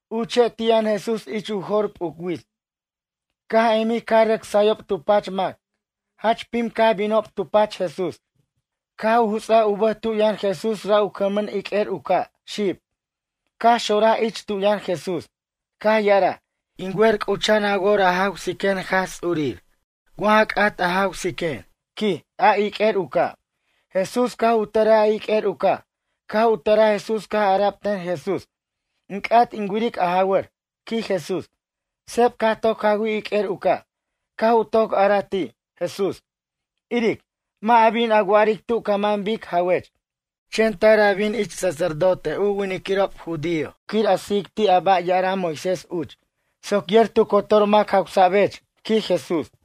Uche' ti' yʌn Jesús ich u jo'r p'uc wits. Caj emij caj rʌc sayob tu pach mac. Jach pim caj binob tu pach Jesús. Caj u juts'aj u bʌj tu yʌn Jesús ra' u cʌnmʌn iq'uer u ca', xib. Caj xonraj ich tu yʌn Jesús. Caj ya'araj: ―In wer c'ucha'an a wor a jawsiquen Jaj Ts'urir wa ja c'at a jawsiquen ―quij a iq'uer u ca'. Jesús caj u tʌraj a iq'uer u ca'. Caj u tʌraj Jesús caj ara'b ten Jesús: ―In c'at in wiric a jawʌr ―quij Jesús. Seb caj toc jawij iq'uer u ca'. Caj u toc araj ti', Jesús: ―Iric, mʌ' a bin a wa'aric tu ca man bic jawech. Chen tar a bin ich sacerdote u winiquirob judío quir a sijic ti' a ba' ya'ara' Moisés uch. Soc yer tu cotor mac jawsa'bech ―quij Jesús.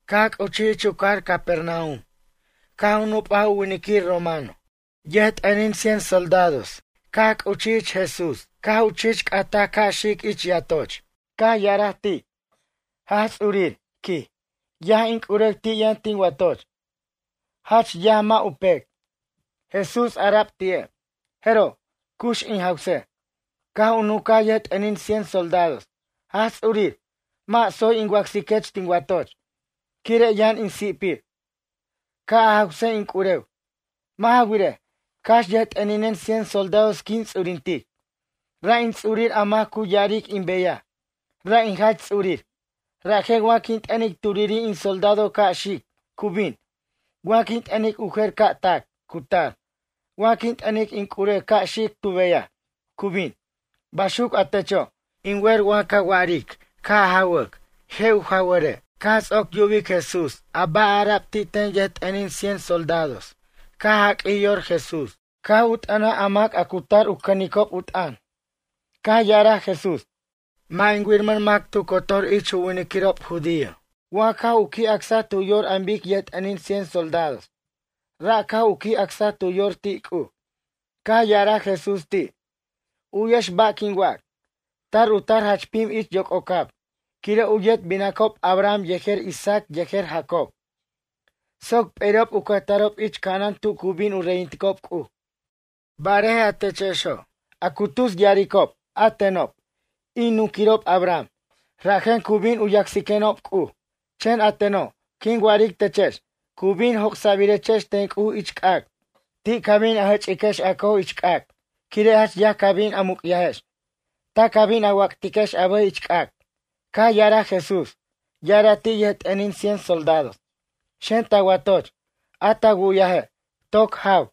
Caj c'uchij ich u cajar Capernaum caj u nup'aj u winiquir romano. Yʌjt'ʌnin cien soldados caj c'uchij ich Jesús caj u chich c'ataj ca' xic ich yatoch. Caj ya'araj ti': ―Jaj Ts'urir ―quij―. Yaj in c'urew ti' yʌn tin watoch. Jach yaj mʌ' u pec. Jesús ara'b ti'e': ―Jeroj, cux in jawsej. Caj u nuncaj yʌjt'ʌnin cien soldados: ―Jaj Ts'urir, mʌ' tsoy in wacsiquech tin watoch, quire' yʌn in si'pir. Ca' a jawsej in c'urew. Mʌ' ja wirej, cax yʌjt'ʌninen cien soldados quin ts'urintic. Ra' in ts'urir a mac a cu ya'aric in beyaj, ra' in jach ts'urir. Rajen wa quin t'ʌnic turiri' in soldado ca' xic, cu bin. Wa quin t'ʌnic u jer ca' tac, cu tar. Wa quin t'ʌnic in c'urew ca' xic tu beyaj, cu bin. Baxuc a techo', in wer wa ca wa'aric ca' jawʌc, je' u jawʌre'. Caj ts'oc yubic Jesús a ba' ara'b ti' ten yʌjt'ʌnin cien soldados caj jaq'uij yor Jesús. Caj u t'ʌnaj a mac a cu tar u cʌnicob u t'ʌn. Caj ya'araj Jesús: ―Mʌ' in wiramʌn mac tu cotor ich u winiquirob judío, wa caj u qui' acsaj tu yor an bic yʌjt'ʌnin cien soldados. Ra' caj u qui' acsaj tu yor ti' C'uj. Caj ya'araj Jesús ti': ―U'yex ba' quin wac. Tar u tar jach pim ich yoc'ocab, quire' u yet binacob Abraham yejer Isaac yejer Jacob, soc p'eri'ob u cʌjtarob ich ca'anan tu cu bin u reyinticob C'uj. Barej a techexo', a cu tus ya'aricob: “A tenob, in nunquirob Abraham, rajen cu bin u yacsiquenob C'uj.” Chen a teno', quin wa'aric techex, cu bin joc'sa'birechex ten C'uj ich c'ac'. Ti' ca bin a jʌch'iquex a cojex ich c'ac', quire' jach yaj ca bin a muc'yajex. Ta ca bin a wac'tiquex a bʌjex ich c'ac'. Caj ya'araj Jesús. Ya'araj ti' yʌjt'ʌnin cien soldados: ―Xen ta watoch. A ta wu'yaje', toc jaw,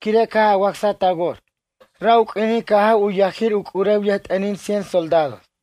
quire' caj a wacsaj ta wor. Ra' u q'uinin caj jaw u yajir u c'urew yʌjt'ʌnin cien soldados.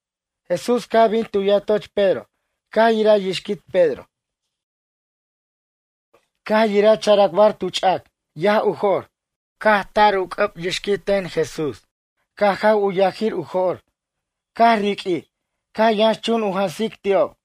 Jesús caj bin tu yatoch Pedro. Caj yiraj yixquit Pedro. Caj yiraj characbar tu ch'ac, yaj u jo'r. Caj tar u c'ʌb yixquit ten Jesús. Caj jaw u yajir u jo'r. Caj riq'uij, caj yʌnx chun u jansic ti'ob.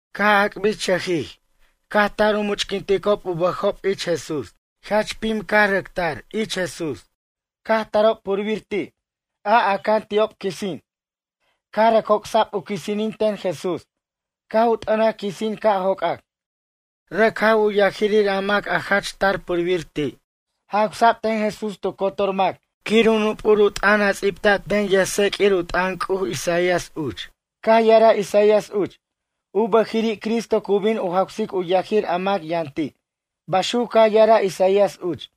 Caj ac'birchʌjij, caj tar u much'quinticob u bʌjob ich Jesús. Jach pim caj rʌc tar ich Jesús. Caj tarob purbir ti', a aca'an ti'ob quisin. Caj rʌc joc'sa'b u quisinin ten Jesús. Caj u t'ʌnaj quisin ca' jocac. Rʌc jaw u yajirir a mac a jach tar purbir ti'. Jawsa'b ten Jesús tu cotor mac quir u nup'ur u t'ʌn a ts'ibta'b ten yʌjtseq'uir u t'ʌn C'uj, Isaías uch. Caj ya'araj Isaías uch: “U bʌjiri' Cristo cu bin u jawsic u yajir a mac yʌn ti'”, baxuc caj ya'araj Isaías uch.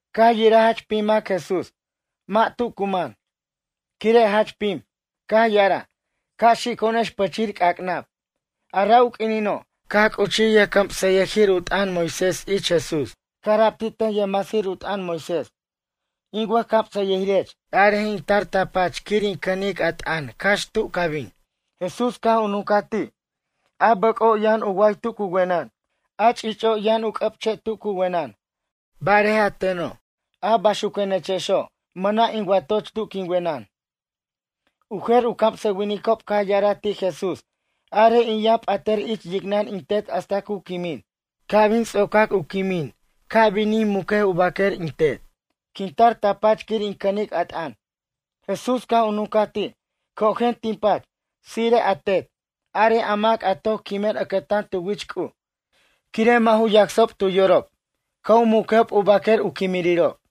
Caj yiraj jach pim mac Jesús. Mʌ' tu cu man, quire' jach pim. Caj ya'araj: ―Ca' xico'onex pʌchir c'ac'nab. A ra' u q'uinino', caj c'uchij yʌjcamsʌyʌjir u t'ʌn Moisés ich Jesús. Caj ara'b ti' ten yʌjcamsʌyʌjir u t'ʌn Moisés: ―In wʌjcamsʌyʌjirech, arej in tar ta pach quir in cʌnic a t'ʌn cax tu ca bin. Jesús caj u nuncaj ti': ―A bʌc'o' yʌn u way tu cu wenʌn. A ch'ich'o' yʌn u c'ʌ'che' tu cu wenʌn. Barej a teno', a baxuquenechexo', mʌna' in watoch tu quin wenʌn. U jer u camsʌwinicob caj ya'araj ti' Jesús: ―Arej in yʌn p'atʌr ich yicnʌn in tet hasta cu quimin. Ca' bin ts'ocac u quimin, caj in mucaj u baquer in tet. Quin tar ta pach quir in cʌnic a t'ʌn. Jesús caj u nuncaj ti': ―Cojen tin pach. Tsire'ej a tet. Arej a mac a toc quimen ʌcʌtan tu wich C'uj, quire' mʌ' ju yacsob tu yorob, ca' u muquejob u baquer u quimirirob.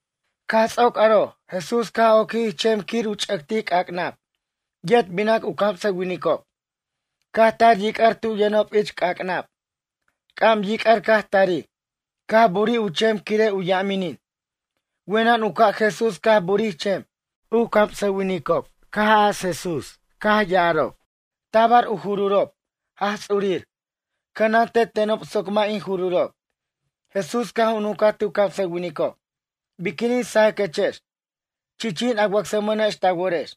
Caj ts'oc aro'. Jesús caj oquij ich chem quir u ch'ʌctic c'ac'nab. Yet binac u camsʌwinicob. Caj tar yic'ar tu yʌnob ich c'ac'nab. C'am yic'ar caj tarij. Caj burij u chem quire' u yaminin. Wenʌn u ca' Jesús caj burij chem. U camsʌwinicob caj as Jesús caj ya'arob: ―Tabar in jururob, Jaj Ts'urir. Cʌnante tenob soc mʌ' in jururob. Jesús caj u nuncaj ti' u camsʌwinicob: ―Biquinin sajaquechex? Chichin a wacsmʌnex ta worex.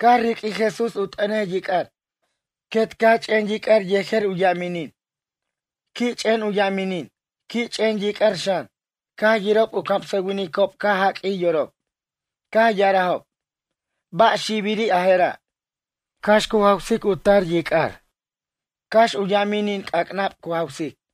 Caj riq'uij Jesús u t'ʌnej yic'ar. Quet caj ch'en yic'ar yejer u yaminin. Qui' ch'en u yaminin. Qui' ch'en yic'ar xan. Caj yirob u camsʌwinicob caj jaq'uij yorob. Caj ya'arajob: ―Ba' xibiri' a jera', cax cu jawsic u tar yic'ar? Cax u yaminin c'ac'nab cu jawsic.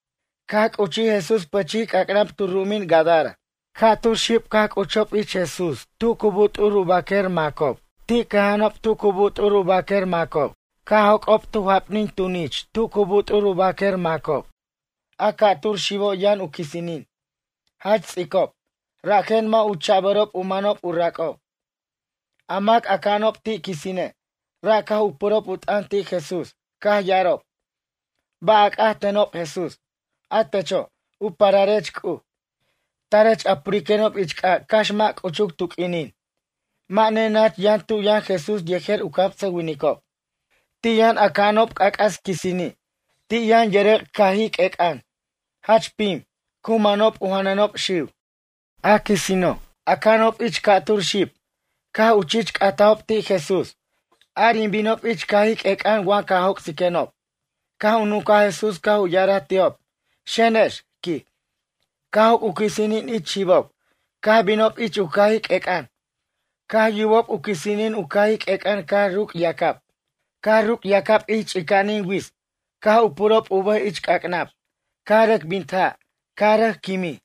Caj c'uchij Jesús pʌchij c'ac'nab tu ru'umin Gadara. Ca'tur xib caj c'uchob ich Jesús tu cu but'ur u baquer macob. Ti' cʌja'anob tu cu but'ur u baquer macob. Caj joc'ob tu japnin tunich tu cu but'ur u baquer macob. A ca'tur xibo' yʌn u quisinin. Jach ts'icob, rajen mʌ' u cha'bʌrob u manob u rac'ob. A mac aca'anob ti' quisine', ra' caj u purob u t'ʌn ti' Jesús. Caj ya'arob: ―Ba' a c'at tenob Jesús? A techo', u pararech C'uj. Tarech a puriquenob ich c'ac' cax mʌ' c'uchuc tu q'uinin? Mʌ' nenach yʌn tu yʌn Jesús yejer u camsʌwinicob. Ti' yʌn aca'anob c'ac'as quisini'. Ti' yʌn yʌrʌc' cajij q'uec'ʌn, jach pim. Cu manob u janʌnob xiw. A quisino', aca'anob ich a ca'tur xib, caj u chich c'atajob ti' Jesús: ―Ar in binob ich cajij q'uec'ʌn wa ca joc'siquenob. Caj u nuncaj Jesús caj u ya'araj ti'ob: ―Xenex ―quij. Caj joc' u quisinin ich xibob, caj bin ich u cajij q'uec'ʌn. Caj yubob u quisinin u cajij q'uec'ʌn caj ruc' yac'ab. Caj ruc' yac'ab ich ch'ica'anin wits. Caj u purob u bʌjob ich c'ac'nab. Caj rʌc bint ja', caj rʌc quimin.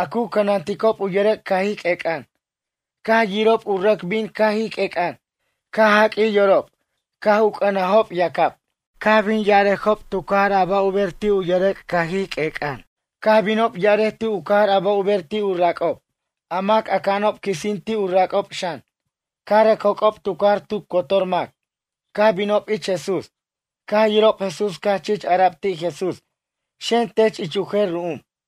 A cu cʌnanticob u yʌrʌc' cajij q'uec'ʌn, caj yirob u rʌc bin cajij q'uec'ʌn, caj jaq'uij yorob. Caj u c'ʌnajob yac'ab, caj u bin ya'arajob tu cajar a ba' u ber ti' u yʌrʌc' cajij q'uec'ʌn. Caj binob ya'arej tu cajar ba' u ber ti' u rac'ob, a mac aca'anob quisin ti' u rac'ob xan. Caj rʌc joc'ob tu cajar tu cotor mac. Caj binob ich Jesús. Caj yirob Jesús caj chich ara'b ti' Jesús: ―Xen tech ich u jer ru'um.